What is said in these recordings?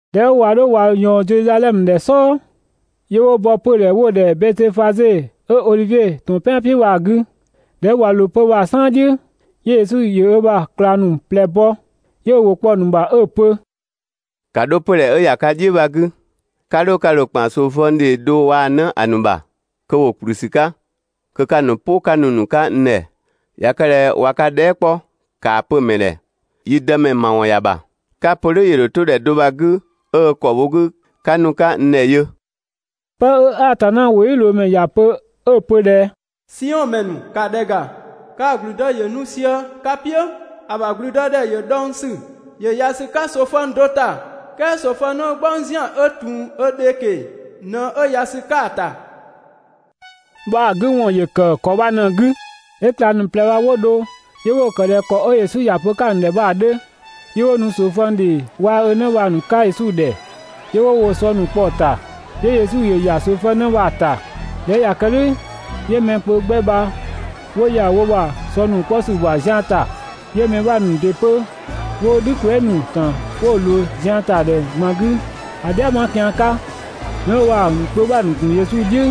꞊Dhɛ 'ö ꞊wa 'dho ꞊wa ꞊yɔɔn Zedhizadhɛmö ‑dhɛ "sɔɔ, 'yö 'wo bɔ 'pödhɛ 'wo‑ ‑dhɛ Bɛtöfaze 'ö Odhivie ‑tɔn "pɛan "piʋ̈ bha‑ 'gü. ꞊Dhɛ 'ö ꞊wa ꞊loo 'pö‑ bha‑ "saan "dhiʋ̈, 'yö Yesu ‑yö ö ‑bha ꞊klang ‑nu ꞊plɛ bɔ, 'yö ö ‑wʋ kpɔ‑ ‑nu ‑bha 'ö‑ pö: «‑Ka 'dho 'pödhɛ 'ö ‑ya ka "dhiʋ̈ bha‑ 'gü, 'ka 'dho ka ‑dho ‑kpan ꞊soofëng ‑dhee do waa‑ ö 'në ‑a ‑nu ‑bha kö ‑wo ‑kplü ‑sü 'ka, kö 'ka‑ ‑nu "pʋ 'ka nu‑ ‑nu 'ka n ‑dhɛ! ꞊Ya kë ꞊dhɛ ꞊wa ka dhɛɛ" 'kpɔ ‑kaa pö‑ ‑mɛ ‑dhɛ: ‹Yi Dëmɛ ‑mawɔn ‑ya ‑bha›. Ka‑ pö "dhʋ̈ ‑yö ‑dho 'to ‑dhɛ do bha‑ 'gü 'ö ö ‑kɔ bho ka 'gü 'ö 'ka nu‑ nu 'ka n ‑dhɛ yö! 'Pë 'ö Atanna ‑wʋdhiʋ̈loomɛ ‑ya pö 'ö‑ pö ꞊dhɛ: ‹Siɔn ‑mɛ ‑nu, ‑ka ‑dhɛ ‑ga, kaa‑ ‑gblüdë ‑yö nu sië ka "piʋ̈, ‑a ‑bha ‑gblüdëdhɛ ‑yö dhɔng ‑sü, ‑yö ‑ya ‑sü 'ka ꞊soofëng do ‑ta, "kɛɛ ꞊soofëng 'në "gbɔng ‑zian 'ö ‑tun ö dhe ꞊keng‑ ꞊në 'ö ‑ya ‑sü 'ka‑ ‑ta› bha‑ 'gü ‑wɔn ‑yö ‑kë ‑kɔ bha ꞊në‑ 'gü. 'Yö ꞊klang ‑nu ꞊plɛ bha 'wo dho, 'yö 'wo‑ ‑kë ꞊dhɛ ‑kɔ 'ö Yesu ‑ya pö‑ 'ka‑ ‑nu ‑dhɛ bha‑ 'dhö. 'Yö 'wo nu ꞊soofëng ‑dhee waa‑ ö 'në bha‑ ‑nu 'ka Yesu ‑dhɛ. 'Yö 'wo woo‑ sɔ ‑nu kpɔ‑ ‑nu ‑ta, 'yö Yesu ‑yö ‑ya ꞊soofëng 'në bha‑ ‑ta. ꞊Dhɛ 'ö ꞊ya kë "dhʋ̈, 'yö mɛ kpö 'gbɛ bha 'wo ‑ya wo ‑bha ‑sɔ ‑nu 'kpɔ ‑sü ‑bha zian ‑ta. 'Yö mɛ 'bha ‑nu ‑dɩ 'pö 'wo "dhü kwɛɛ" ‑nu ‑kan 'wo‑ ‑nu ꞊loo ‑zian ‑ta ‑dhɛ ꞊gban 'gü (‑a "dhiama kian 'ka). 'Mɛ 'wo bha‑ ‑nu kpö 'bha‑ ‑gun Yesu "dhiʋ̈,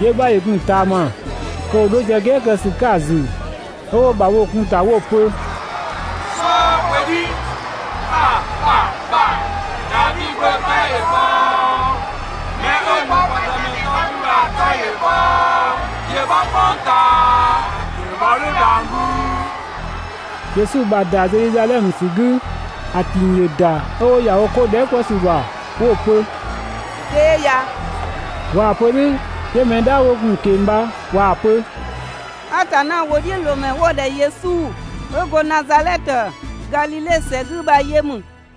'yö‑ 'bha ‑yö gun‑ ꞊taama, kö ‑wo 'dho sië "gɛɛ kë ‑sü 'ka‑ ‑zü, 'ö 'wo ‑bhabhoo kun‑ ‑ta 'wo‑ pö: «"Sookwedhi, ‑bha ‑bha ‑bha, Davi Gbö 'tɔ ‑yö bhɔɔɔɔ! 'Mɛ 'ö nu kwa Dëmɛ 'tɔ 'gü bha‑ 'tɔ ‑yö bhɔɔɔ, ‑yö ‑bhɔ "kpʋng ꞊taa! ‑Yö bhɔ "dhʋ̈ dhang‑ "güüü! Yesu ‑bha ‑da Zedhizadhɛmö ‑sü 'gü, ‑a ‑ting ‑yö ‑da 'ö 'wo ‑ya wo 'ko ‑nu dhɛɛ" 'kpɔ ‑sü ‑bha 'wo‑ pö: «Dee ya!» ꞊Waa‑ pö "dhʋ̈, 'yö mɛ "dhaa 'wo gun‑ ꞊keng‑ bha ꞊waa‑ pö: «Atanna ‑wʋdhiʋ̈loomɛ 'wo‑ ‑dhɛ Yesu, 'ö go Nazadhɛtö Gadhidhe ‑sɛ 'gü bha yö ‑mü.»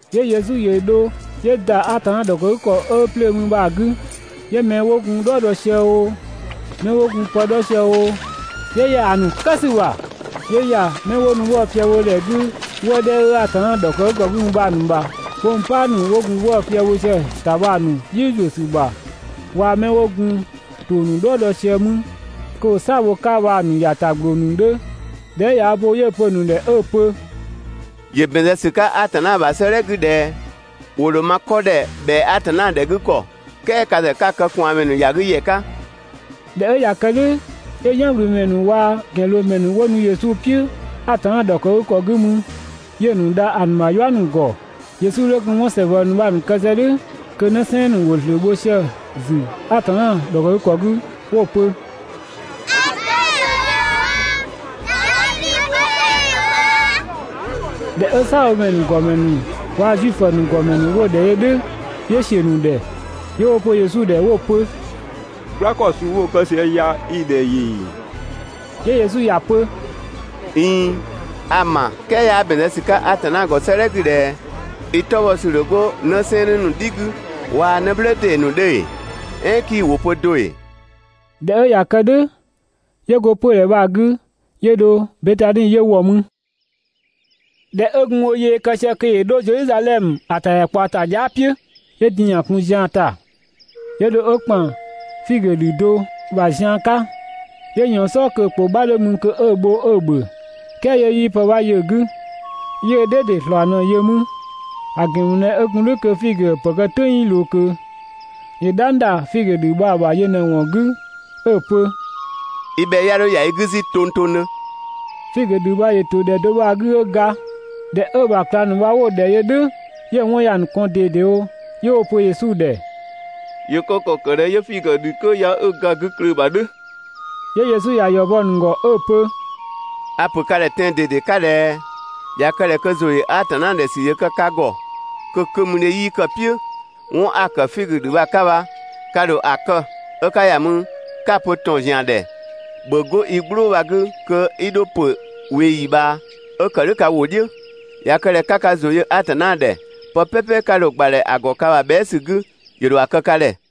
'Yö Yesu ‑yö dho 'yö ‑da Atanna ‑dhɔkëgükɔ 'ö 'plöö mü bha‑ 'gü. 'Yö 'mɛ 'wo gun "dhɔɔ dɔ sië oo, 'mɛ 'wo gun pë 'dhɔ sië oo, 'yö ‑ya ‑a ‑nu kë ‑sü ‑bha, 'yö ‑ya 'mɛ 'wo nu 'wëë‑ fië bho ‑dhɛ 'gü 'wëë‑ 'dhɛ 'ö Atanna ‑dhɔkëgükɔ 'gü mü bha‑ ‑bha bha‑ ‑nu ‑bha 'kpongpaa ‑nu 'wo gun 'wëë‑ fië bho sië‑ ‑ta bha‑ ‑nu "dhiʋ̈ ‑zuö ‑sü ‑bha, waa‑ 'mɛ 'wo gun ‑tong ‑nu "dhɔɔ dɔ sië mü (kö ‑wo "saa‑ bho‑ 'ka bha‑) ‑nu ‑ya ‑ta ‑gbloo ‑nu 'dhö. ꞊Dhɛ 'ö ꞊ya ö bo 'yö‑ pö‑ ‑nu ‑dhɛ 'ö‑ pö: «‑Yö ‑bɛn zë ‑sü 'ka Atanna ‑bha 'sëëdhɛ 'gü ꞊dhɛ: ‹‑Wo ‑dho ma 'kɔ ‑dhɛ ‑bhɛa Atanna ‑dhɛ 'gü ‑kɔ› "kɛɛ ka ‑zë 'ka‑ kë ꞊kwaanmɛ ‑nu ‑ya 'gü ‑yɛ 'ka.» ꞊Dhɛ 'ö ꞊ya kë "dhʋ̈, 'yö "yanwlümɛ ‑nu waa‑ ‑gɛnloomɛ ‑nu 'wo nu Yesu "piʋ̈ Atanna ‑dhɔkëgükɔ 'gü mü, 'yö‑ ‑nu dha ‑a ‑nu ‑bha "yua ‑nu ‑gɔ. Yesu 'dhö gun 'wɔn ‑sɛsɛngbɔ ‑nu bha‑ ‑nu kë sië "dhʋ̈ kö 'në 'sɛɛnnë ‑nu ‑wo ‑zlöö bho sië‑ ‑zü Atanna ‑dhɔkëgükɔ 'gü 'wo‑ pö: «‑A 'tɔ ‑yö bhɔ! Davi Gbö 'tɔ ‑yö bhɔ! ꞊Dhɛ 'ö "saabhomɛ ‑nu ‑gɔmɛ ‑nu waa‑ Zuifö ‑nu ‑gɔmɛ ‑nu 'wo‑ ‑dhɛ yö "dhʋ̈, 'yö ‑siö ‑nu ‑dhɛ. 'Yö 'wo‑ pö Yesu ‑dhɛ 'wo‑ pö: «"Gbla ‑kɔ suu 'wo‑ kë sië ya i‑ ‑dhɛ ‑yö ‑ee?» 'Yö Yesu ‑ya pö: «꞊Iin, a‑ ‑ma "kɛɛ 'yaa ‑bɛn zë ‑sü 'ka Atanna ‑gɔ 'sëëdhɛ 'gü ꞊dhɛ: ‹I 'tɔ bhɔ ‑sü ‑dho 'go 'në 'sɛɛnnë ‑nu "dhi 'gü, waa‑ 'në "blë ‑dee ‑nu 'dhö ‑ee?› "Ɛɛn 'kii‑ ‑wʋ pö do ‑ee?» ꞊Dhɛ 'ö ꞊ya kë "dhʋ̈, 'yö go 'pödhɛ bha‑ 'gü 'yö dho Betani 'yö ‑wɔ mü. ꞊Dhɛ 'ö gun ö yee kë sië kö ‑yö 'dho Zedhizadhɛmö ‑a ‑tadhɛkpaɔta dhia" "piʋ̈, 'yö din‑ ‑ya kun zian ‑ta. 'Yö dho 'ö ‑kpan figö ‑dhü do ‑bha zian 'ka, 'yö ꞊yɔɔn‑ "sɔɔ kö‑ ‑kpʋ 'bha 'dhö mü kö 'ö‑ bho 'ö‑ ‑bhö, "kɛɛ 'yö 'yii pë 'bha yö‑ 'gü, 'yö‑ "dhɛ ‑dɩ ‑slɔɔ ꞊në yö mü, (‑a ‑gɛn ‑mü ꞊dhɛ 'ö gun "dhʋ̈ kö figö ‑pë kë "tʋ̈ng 'yii ꞊loo ꞊kö), ‑yö "dhang ‑da figö ‑dhü bha‑ ‑bha yö ꞊në‑ ‑wɔn 'gü 'ö‑ pö: «I bhɛ 'ya 'dho ‑ya i 'gü 'zü tongtongdhö!» Figö ‑dhü bha ‑yö ‑to ‑dhɛ do bha‑ 'gü 'ö ga. ꞊Dhɛ 'ö‑ ‑bha ꞊klang ‑nu bha 'wo‑ ‑dhɛ yö "dhʋ̈, 'yö‑ 'wɔn ‑ya ‑nu kɔn ꞊dedewo 'yö 'wo‑ pö Yesu ‑dhɛ: «‑Yö kë ‑kɔ ‑kë ꞊dhɛ 'yö figö ‑dhü 'kö ya 'ö ga 'gü klöö‑ ‑bha "dhʋ̈?» 'Yö Yesu ‑ya ‑yɔ bɔ‑ ‑nu ‑gɔ 'ö‑ pö: «A‑ ‑pö ka ‑dhɛ tɛan‑ ꞊dede 'ka ꞊dhɛ: ꞊Ya kë ꞊dhɛ kö ‑zʋ ‑yö Atanna ‑dhɛ ‑sü ‑yö kë ka ‑gɔ kö 'kömüdhe 'yii kë‑ "piʋ̈, 'wɔn 'a‑ ‑kë figö ‑dhü bha‑ 'ka bha, ka ‑dho ‑a kë 'ö ka ‑ya mü 'ka‑ pö ‑tɔn ‑zian ‑dhɛ: ‹‑Bhö 'go i "gblʋʋ bha‑ 'gü kö 'i dho ‑pö ꞊weeyi ꞊bhaa!› 'ö ‑kë "dhʋ̈ ka ‑wʋ "dhiʋ̈. ꞊Ya kë ꞊dhɛ 'ka ka ‑zʋ yö Atanna ‑dhɛ, pë "pɛpɛ 'ka dho‑ ‑gbadhɛ ‑a ‑gɔ ka ‑bha bhɛa" ‑sü 'gü, ‑yö ‑dho ‑a kë ka ‑dhɛ.»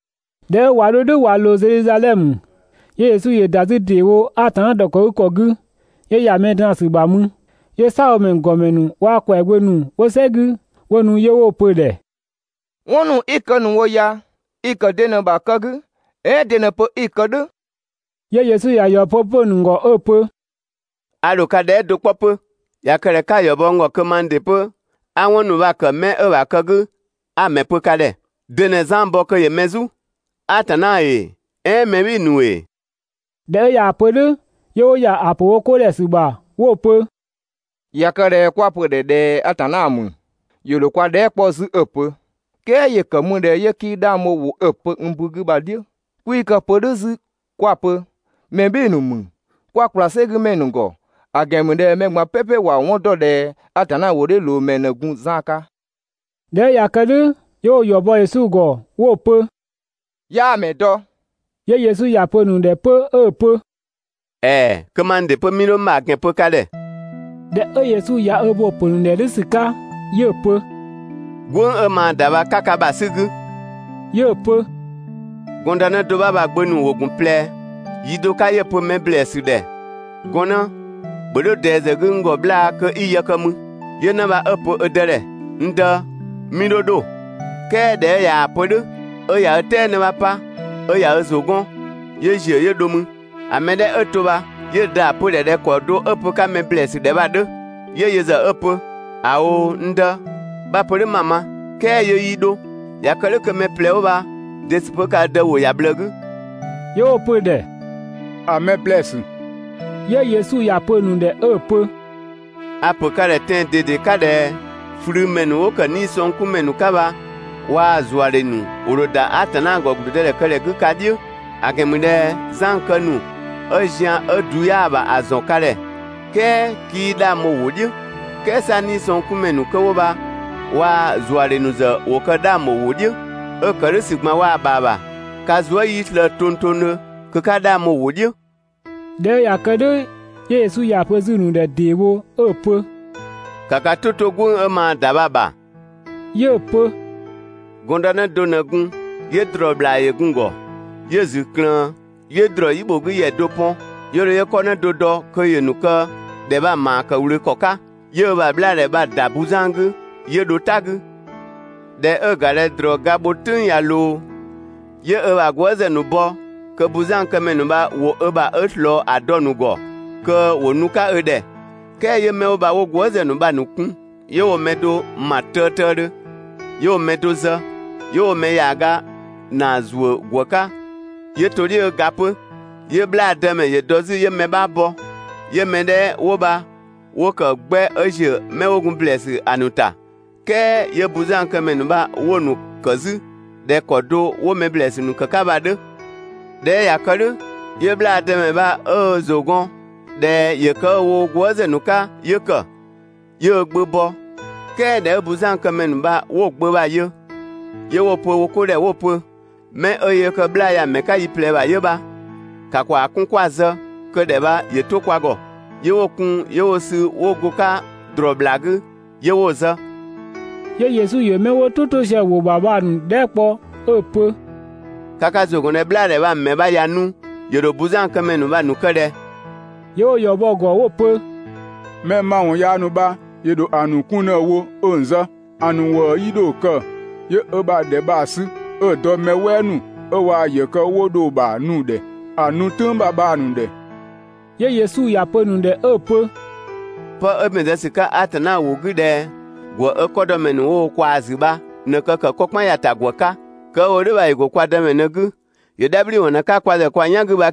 ꞊Dhɛ 'ö ꞊wa 'dho "dhʋ̈ ꞊wa ꞊loo Zedhizadhɛmö, 'yö Yesu ‑yö ‑da 'zü ‑deewo Atanna ‑dhɔkëgükɔ 'gü, 'yö ‑ya mɛ draan‑ ‑sü ‑bha mü. 'Yö "saabhomɛ ‑nu ‑gɔmɛ ‑nu waa‑ ‑kwɛagbö ‑nu 'wo "sɛ 'gü, 'wo nu 'yö 'wo‑ pö‑ ‑dhɛ: «'Wɔn ‑nu 'i‑ ‑kë ‑nu wo ya, i‑ ‑kë de ꞊në‑ ‑bha kë 'gü? "Ɛɛn de ꞊në‑ pö 'i‑ kë "dhʋ̈?» 'Yö Yesu ‑ya ‑yɔ bɔ 'pö‑ ‑nu ‑gɔ 'ö‑ pö: «A ‑dho ka dhɛɛ" do 'kpɔ 'pö, ꞊ya kë ꞊dhɛ 'ka‑ ‑yɔ bɔ n ‑gɔ kö mang ‑dɩ 'pö 'a 'wɔn ‑nu bha‑ kë 'mɛ 'ö‑ ‑bha kë 'gü kö 'a‑ ‑mɛ pö ka ‑dhɛ. De ꞊në Zan bɔ kö ‑yö mɛ "zu? Atanna ‑ee, "ɛɛn mɛ "bhɩɩ‑ ‑nu ‑ee?» ꞊Dhɛ 'ö ꞊yaa‑ pö "dhʋ̈, 'yö 'wo ‑ya ‑a ‑pö wo 'ko ‑dhɛ ‑sü ‑bha 'wo‑ pö: «꞊Ya kë ꞊dhɛ 'kwa‑ pö‑ ‑dhɛ ꞊dhɛ Atanna ‑mü, ‑yö ‑dho kwa dhɛɛ" 'kpɔ 'zü 'ö‑ pö: ‹"Kɛɛ ‑yö ‑kë ‑mü ꞊dhɛ 'yö 'kii 'dhang bho ‑wʋ 'ö‑ pö n ‑bu 'gü bha‑ "dhiʋ̈?›. 'Kwii kë‑ pö "dhʋ̈ 'zü 'kwa‑ pö: ‹Mɛ "bhɩɩ‑ ‑nu ‑mü› 'kwa ‑kpla "sɛgümɛ ‑nu ‑gɔ, ‑a ‑gɛn ‑mü ꞊dhɛ mɛ ꞊gban "pɛpɛ ‑wa 'wɔn ‑dɔ ꞊dhɛ Atanna ‑wʋdhiʋ̈loomɛ ꞊në gun Zan 'ka.» ꞊Dhɛ 'ö ꞊ya kë "dhʋ̈, 'yö 'wo‑ ‑yɔ bɔ Yesu ‑gɔ 'wo‑ pö: «'Yaa‑ ‑mɛ dɔ.» 'Yö Yesu ‑ya pö‑ ‑nu ‑dhɛ 'pö 'ö‑ pö: «‑Ɛɛ, kö mang ‑dɩ 'pö 'mii 'dho n ‑bha ‑gɛn pö ka ‑dhɛ.» ꞊Dhɛ 'ö Yesu ꞊ya ö bo‑ ‑pö ‑nu ‑dhɛ "dhʋ̈ ‑sü 'ka, 'yö‑ pö: «"Gwënng 'ö maa ‑da bha, 'ka ka ‑bha 'sü‑ 'gü!» 'Yö‑ pö: «Gɔndënë do 'bha bha‑ gbö ‑nu ‑wo ‑gun ꞊plɛ. Yi do 'ka 'yö‑ pö‑ mɛ ‑blɛɛsü ‑dhɛ: «Gɔnnë, ‑bhö 'dho ꞊dɛɛ ‑zë 'gü n ‑gɔ 'bhlaa‑ kö 'i yë kë 'mü!» 'Yö 'në bha 'ö‑ pö ö dë ‑dhɛ: «N dë, 'mii 'dho 'dho.» "Kɛɛ ꞊dhɛ 'ö ꞊yaa‑ pö "dhʋ̈, 'ö ꞊ya ö "tɛɛ 'në 'bha 'pa 'ö ꞊ya ö ‑zʋ 'gɔn, 'yö ‑ziö 'yö dho mü. ‑A mɛ 'dhɛ 'ö to bha 'yö‑ dë ‑ya pö 'pö‑ ‑dhɛ ꞊dhɛ ‑kɔ do 'ö‑ pö‑ 'ka mɛ ‑blɛɛsü ‑dhɛ bha‑ 'dhö. 'Yö yö ‑zë 'ö‑ pö: «‑A ꞊oo, n dë, 'bha‑ pö "dhʋ̈ 'ma‑ ma.» "Kɛɛ 'yö 'yii 'dho. ꞊Ya kë "dhʋ̈ kö mɛ ꞊plɛ bha‑ de ‑sü 'pö kë ö dë ‑wʋ ‑ya ꞊bhlëë 'gü?» 'Yö 'wo‑ pö‑ ‑dhɛ: «‑A mɛ ‑blɛɛsü.» 'Yö Yesu ‑ya pö‑ ‑nu ‑dhɛ 'ö‑ pö: «A‑ ‑pö ka ‑dhɛ tɛan‑ ꞊dede 'ka ꞊dhɛ: ꞊Flümɛ ‑nu 'wo ‑kë 'niisɔngkunmɛ ‑nu 'ka bha waa‑ ‑zuadhe ‑nu ‑wo ‑dho ‑da Atanna ‑gɔ ‑gblüdëdhɛ 'gü ka "dhiʋ̈. ‑A ‑gɛn ‑mü ꞊dhɛ Zan kë ‑nu 'ö zian 'ö‑ du 'yaa ‑bha ‑a ‑zɔn ka ‑dhɛ, "kɛɛ 'kii 'dhang bho‑ ‑wʋ "dhiʋ̈, "kɛɛ 'sa 'niisɔngkunmɛ ‑nu 'kö 'wo bha waa‑ ‑zuadhe ‑nu ‑zë ‑wo kë 'dhang bho‑ ‑wʋ "dhiʋ̈, 'ö‑ ‑kë "dhʋ̈ ‑sü ꞊gban waa‑ ‑bha ‑bha, ka zuë" 'yii slëë‑ tongtongdhö kö 'ka 'dhang bho‑ ‑wʋ "dhiʋ̈.» ꞊Dhɛ 'ö ꞊ya kë "dhʋ̈ 'yö Yesu ‑ya pö 'zü‑ ‑nu ‑dhɛ ‑deewo 'ö‑ pö: «‑Ka ka "tʋ 'to "gwënng 'ö maa‑ ‑da bha‑ ‑bha!» 'Yö‑ pö: «Gɔndënë do ꞊në gun, 'yö ‑drɔɔ ‑bhlaa ‑yö gun‑ ‑gɔ. 'Yö‑ ‑zü ꞊klëën, 'yö ‑drɔɔ "yi ‑bho 'gü ‑yɛ do pɔn, 'yö dho 'yö 'kɔ 'në do dɔ kö ‑yö ‑nu kë ‑dhɛ bha‑ ‑maa ‑kë ꞊wlöö ‑kɔ 'ka. 'Yö ö ‑bha 'bhlaadhɛ bha‑ ‑da buzan 'gü, 'yö dho "ta 'gü. ꞊Dhɛ 'ö‑ ‑ga ꞊dhɛ ‑drɔɔ ga bho "tʋ̈ng ꞊ya ꞊loo, 'yö ö ‑bha gwëëzë ‑nu bɔ kö buzankëmɛ ‑nu bha ‑wo ö ‑bha 'ö ꞊slɔɔ ‑a dɔ‑ ‑nu ‑gɔ kö ‑wo nu‑ 'ka ö ‑dhɛ. "Kɛɛ 'yö 'mɛ 'wo bha 'wo gwëëzë ‑nu bha‑ ‑nu kun 'yö 'wo‑ mɛ do ‑ma tëëtëëdhö, 'yö 'wo‑ mɛ do zë, 'yö 'wo‑ mɛ ‑yaaga ‑naa ‑zuö ‑gwë 'ka 'yö to‑ "dhiʋ̈ 'ö ga 'pö. 'Yö 'bhlaa dëmɛ ‑yö dɔ 'zü 'yö‑ mɛ 'bha bɔ, 'yö mɛ 'dhɛ 'wo bha 'wo ‑kë 'gbɛ 'ö ‑ziö 'mɛ 'wo gun ‑blɛɛsü ‑a ‑nu ‑ta, "kɛɛ 'yö buzankëmɛ ‑nu bha 'wo‑ ‑nu ‑kë 'zü ꞊dhɛ ‑kɔ do 'wo mɛ ‑blɛɛsü ‑nu ‑kë 'ka bha‑ 'dhö. ꞊Dhɛ 'ö ꞊ya kë "dhʋ̈, 'yö 'bhlaa‑ dëmɛ bha 'ö ö ‑zʋ gɔn ꞊dhɛ ‑yö kë 'ö‑ wo gwëëzë ‑nu 'ka 'yö ‑kë. 'Yö ö gbö bɔ. "Kɛɛ ꞊dhɛ 'ö buzankëmɛ ‑nu bha 'wo‑ gbö bha‑ yö, 'yö 'wo‑ pö wo 'ko ‑dhɛ 'wo‑ pö: «'Mɛ 'ö yöö kë 'bhlaa‑ ya‑ ‑mɛ 'ka yiplɛɛbha 'yö bha, ‑ka kwaa‑ 'kun 'kwa‑ zë kö ‑dhɛ bha ‑yö 'to kwa ‑gɔ!» 'Yö 'wo‑ kun 'yö 'wo‑ sü 'wo go‑ 'ka ‑drɔɔ ‑bhlaa 'gü, 'yö 'wo‑ zë. 'Yö Yesu ‑yö 'mɛ 'wo "tʋ 'to sië‑ ‑wʋ ‑bha bha‑ ‑nu dhɛɛ" kpɔ 'ö‑ pö: «Ka ka ‑zʋ ‑gɔn ꞊dhɛ 'bhlaadhɛ bha‑ ‑mɛ bha ꞊ya nu, ‑yö ‑dho buzankëmɛ ‑nu bha‑ ‑nu kë ꞊dhɛ?» 'Yö 'wo‑ ‑yɔ bɔ‑ ‑gɔ 'wo‑ pö: «Mɛ ‑mawɔn yaa ‑nu bha ‑yö ‑dho ‑a ‑nu 'kun ꞊në‑ wo 'ö‑ ‑nu zë, ‑a ‑nu ‑wëë 'yii 'dho‑ kë, 'yö ö ‑bha ‑dhɛ bha‑ sü 'ö ‑dɔ mɛ "wɛɛ ‑nu 'ö ꞊waa‑ ‑yë kë 'wo dho‑ ‑bha nu‑ ‑dhɛ ‑a ‑nu "tʋ̈ng ‑bha bha‑ ‑nu ‑dhɛ.» 'Yö Yesu ‑ya pö‑ ‑nu ‑dhɛ 'ö‑ pö: «Pë 'ö ‑bɛn zë ‑sü 'ka Atanna ‑wʋ 'gü ꞊dhɛ: ‹‑Gwë 'ö 'kɔdɔmɛ ‑nu 'wo wo ꞊kwaa‑ ‑zü bha ꞊në, kë ‑kë 'kɔ "kpan ‑ya ‑ta ‑gwë 'ka› bha 'kii‑ ma do ‑ee? "Ɛɛn 'yaa ‑bɛn zë ‑sü 'ka "dhʋ̈ ‑ee? ‹Kë 'ö‑ wo "dhʋ̈ bha ‑yö ‑go kwa Dëmɛ ꞊në‑ 'gü, ‑yö "dhabhliwɔn 'ka kwa ‑zë kwa "yan 'gü.›»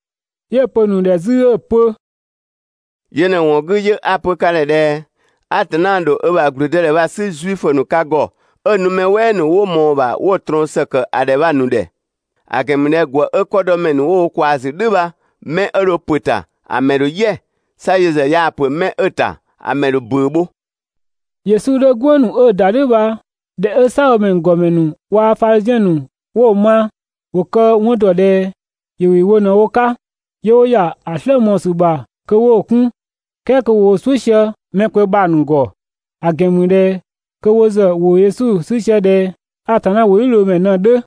'Yö‑ pö‑ ‑nu ‑dhɛ 'zü 'ö‑ pö: «Yö ꞊në ‑wɔn 'gü 'yö 'a‑ pö ka ‑dhɛ ꞊dhɛ: Atanna ‑dho ö ‑bha ‑gblüdëdhɛ bha‑ 'sü (Zuifö ‑nu) ka ‑gɔ 'ö‑ nu mɛ "wɛɛ ‑nu 'wo ꞊mɔɔ‑ ‑bha 'wo‑ ꞊trɔɔn ‑së ‑kë ‑a ‑dhɛ bha‑ ‑nu ‑dhɛ. ‑A ‑gɛn ‑mü ꞊dhɛ ‑gwë 'ö 'kɔdɔmɛ ‑nu ‑wo wo ꞊kwaa‑ ‑zü "dhʋ̈ bha 'mɛ 'ö dho ‑pö ‑ta, ‑a ‑mɛ ‑dho "yɛ, 'sa yö ‑zë yaa‑ ‑pö 'mɛ 'ö‑ ‑ta ‑a ‑mɛ ‑dho ‑bʋ̈ʋ̈ bho.» Yesu 'dhö "gwënng ‑nu 'ö ‑da "dhʋ̈ bha ꞊dhɛ 'ö "saabhomɛ ‑nu ‑gɔmɛ ‑nu waa‑ Fadhiziɛn ‑nu 'wo‑ ma, ‑wo kë‑ 'wɔn ‑dɔ ꞊dhɛ ‑yö ‑wɩ wo ꞊në wo 'ka. 'Yö 'wo ‑ya ‑a "slë mɔɔ‑ ‑sü ‑bha kö 'wo‑ 'kun, "kɛɛ kö ‑wo "suʋ̈ sië mɛ kpö bha‑ ‑nu ‑gɔ, ‑a ‑gɛn ‑mü ꞊dhɛ kö wo ‑zë ‑wo Yesu 'sü sië ꞊dhɛ Atanna ‑wʋdhiʋ̈loomɛ ꞊në‑ 'dhö.